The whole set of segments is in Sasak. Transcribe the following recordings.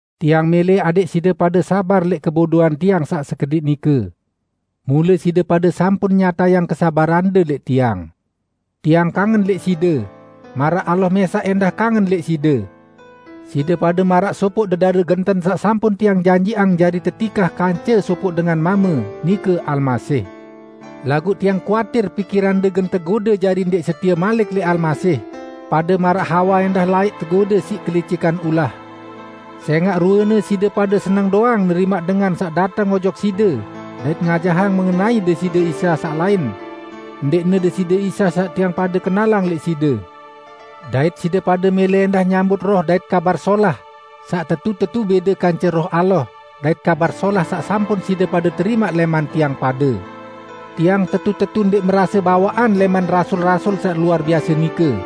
Tiang mẽlẽ adẽq side pade sabar lẽq kebodoan tiang saq sekediq nike. Mule side pade sampun nyatayang kesabarande lẽq tiang. Tiang kangen lẽq side, maraq Allah mẽsaq ẽndah kangen lẽq side. Side pade maraq sopoq dedare genten saq sampun tiang janjiqang jari tetikah kance sopoq dengan mame, nike Almasih. Laguq tiang kuatir pikirande gen tegode jari ndẽq setie malik lẽq Almasih, pade maraq Hawa laẽq ẽndah tegode siq kelicikan ulah. Sẽngaq ruene side pade seneng doang nerimaq dengan saq dateng ojok side dait ngajahang mengenai Deside Isa saq lain -- ndẽqne Deside Isa saq tiang pade kenalang lẽq side. Dait side pade mẽlẽ ẽndah nyambut roh dait "kabar solah" saq tetu-tetu bẽde kance Roh Allah dait Kabar Solah saq sampun side pade terimaq lẽman tiang pade. Tiang tetu-tetu ndẽq merase bawaqan lẽman "rasul-rasul" saq luar biase nike!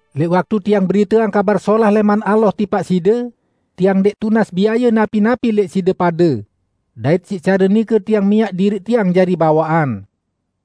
Lẽq waktu tiang beriteang Kabar Solah lẽman Allah tipaq side, tiang ndẽq tunas biaye napi-napi lẽq side pade; dait siq care nike tiang miaq diriq tiang jari bawaqan.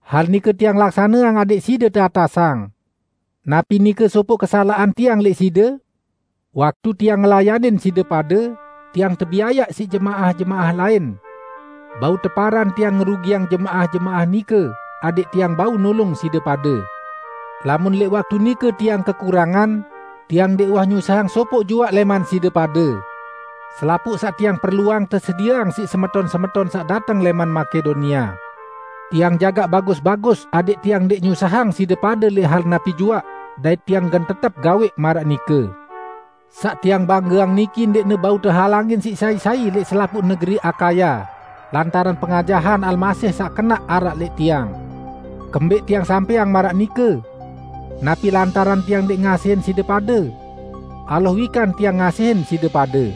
Hal nike tiang laksaneang adẽq side saq teatasang. Napi nike sopoq kesalaqan tiang lẽq side? Waktu tiang ngelayanin side pade, tiang tebiayaq siq jemaah-jemaah lain. Bau teparan tiang ngerugiang jemaah-jemaah nike adẽq tiang bau nulung side pade. Lamun lẽq waktu nike tiang kekurangan, tiang ndẽq uwah nyusahang sopoq juaq lẽman side pade. Selapuq saq tiang perluang tesedieang siq semeton-semeton saq dateng lẽman Makedonia. Tiang jagaq bagus-bagus adẽq tiang ndẽq nyusahang side pade lẽq hal napi juaq, dait tiang gen tetep gawẽq maraq nike. Saq tiang banggeang niki ndẽqne bau tehalangin siq sai-sai lẽq selapuq negeri Akaya, lantaran pengajahan Almasih saq kenaq araq lẽq tiang. Kembẽq tiang sampẽang maraq nike? Napi lantaran tiang ndẽq ngasihin side pade? Allah wikan tiang ngasihin side pade!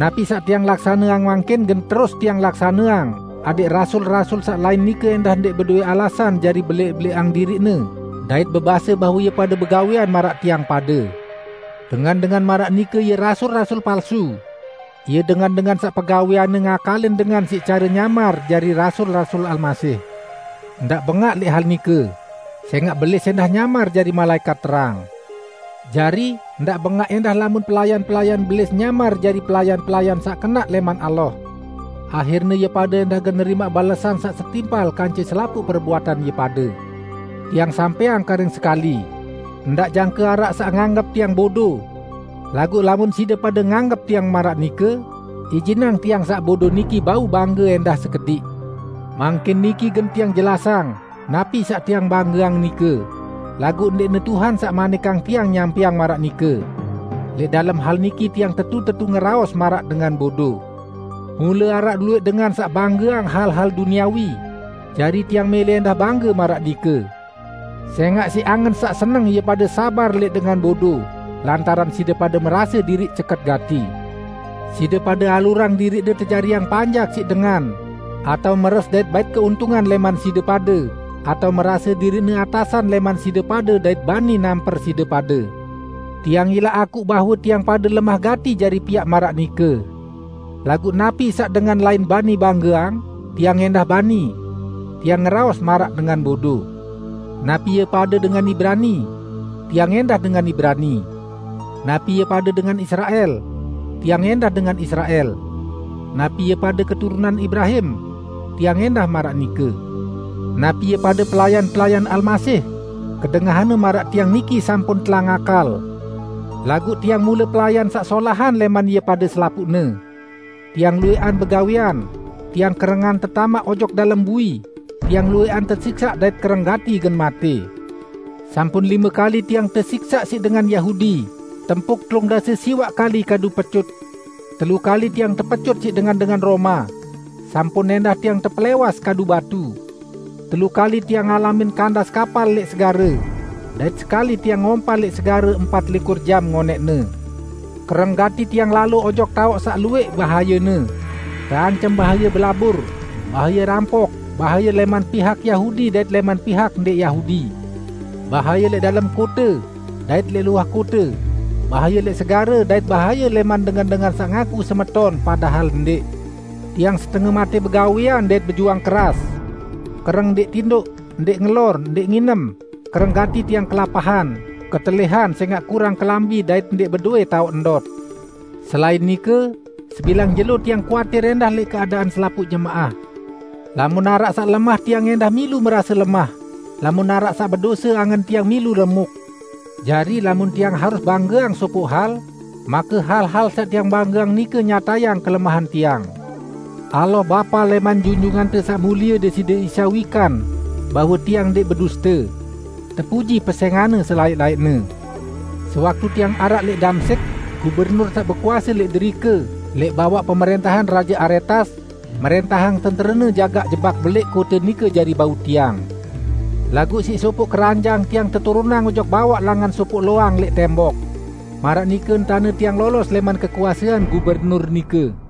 Napi saq tiang laksaneang mangkin gen terus tiang laksaneang adẽq "rasul-rasul" saq lain nike ndẽq bedowẽ alasan jari belẽq-belẽqang diriqne dait bebase bahwe ie pade begawẽan maraq tiang pade. Dengan-dengan maraq nike ie rasul-rasul palsu. Ie dengan-dengan saq pegawẽanne ngakalin dengan siq care nyamar jari rasul-rasul Almasih. Ndaq bengaq lẽq hal nike, sẽngaq Belis ẽndah nyamar jari malaẽkat terang! Jari, ndaq bengaq ẽndah lamun pelayan-pelayan Belis nyamar jari pelayan-pelayan saq kenaq lẽman Allah. Ahirne ie pade ẽndah gen nerimaq balesan saq setimpal kance selapuq perbuatan ie pade. Tiang sampẽang karing sekali: Ndaq jangke araq saq nganggep tiang bodo. Laguq lamun side pade nganggep tiang maraq nike, ijinang tiang saq bodo niki bau bangge ẽndah sekediq. Mangkin niki gen tiang jelasang, napi saq tiang banggeang nike, laguq ndẽqne Tuhan saq manikang tiang nyampẽang maraq nike. Lẽq dalem hal niki tiang tetu-tetu ngeraos maraq dengan bodo. Mule araq luwẽq dengan saq banggeang hal-hal duniawi, jari tiang mẽlẽ ẽndah bangge maraq nike. Sẽngaq siq angen saq seneng ie pade sabar lẽq dengan bodo, lantaran side pade merase diriq ceket gati! Side pade alurang diriqde tejariang panjak siq dengan, atao meres dait bait keuntungan lẽman side pade, atao merase diriqne atasan lẽman side pade dait bani namper side pade. Tiang ilaq akuq bahwe tiang pade lemah gati jari piaq maraq nike. Laguq napi saq dengan lain bani banggeang, tiang ẽndah bani! (Tiang ngeraos maraq dengan bodo.) Napi ie pade dengan Ibrani? Tiang ẽndah dengan Ibrani. Napi ie pade dengan Israel? Tiang ẽndah dengan Israel. Napi ie pade keturunan Ibrahim? Tiang ẽndah maraq nike! Napi ie pade pelayan-pelayan Almasih? Kedengahanne maraq tiang niki sampun telang akal, laguq tiang mule pelayan saq solahan lẽman ie pade selapuqne! Tiang luwẽqan begawẽan, tiang kerengan tetamaq ojok dalem bui, tiang luwẽqan tesiksaq dait kereng gati gen matẽ. Sampun lime kali tiang tesiksaq siq dengan Yahudi, tempuk telung dase siwaq kali kadu pecut. Telu kali tiang tepecut siq dengan-dengan Roma; sampun ẽndah tiang tepelẽwas kadu batu. Telu kali tiang ngalamin kandas kapal lẽq segare, dait sekali tiang ngompal lẽq segare empat likur jam ngonẽqne. Kereng gati tiang lalo ojok taoq saq luwẽq bahayene: Teancem bahaye belabur, bahaye rampok, bahaye lẽman pihak Yahudi dait lẽman pihak ndẽq Yahudi, bahaye lẽq dalem kote, dait lẽq luah kote, bahaye lẽq segare, dait bahaye lẽman dengan-dengan saq ngaku semeton padahal ndẽq. Tiang setenge matẽ begawẽan dait bejuang keras: Kereng ndẽq tindoq, ndẽq ngelor, ndẽq nginem, kereng gati tiang kelapahan, ketelihan sẽngaq kurang kelambi dait ndẽq bedowẽ taoq ndot. Selain nike, sebilang jelo tiang kuatir ẽndah lẽq keadaan selapuq jemaah. Lamun araq saq lemah tiang ẽndah milu merase lemah. Lamun araq saq bedose, angen tiang milu remuk. Jari, lamun tiang harus banggeang sopoq hal, make hal-hal saq tiang banggeang nike nyatayang kelemahan tiang. Allah, Bapa lẽman Junjungante Saq Mulie Deside Isa, wikan bahwe tiang ndẽq beduste. Tepuji pesẽngan-Ne selaẽq-laẽqne. Sewaktu tiang araq lẽq Damsyik, gubernur saq bekuase lẽq derike, lẽq bawaq pemrẽntahan Raje Aretas, mrẽntahang tenterene jagaq jebak belẽq kote nike jari bau tiang. Laguq siq sopoq keranjang tiang teturunang ojok bawaq langan sopoq loang lẽq tembok. Maraq nike entane tiang lolos lẽman kekuasean gubernur nike.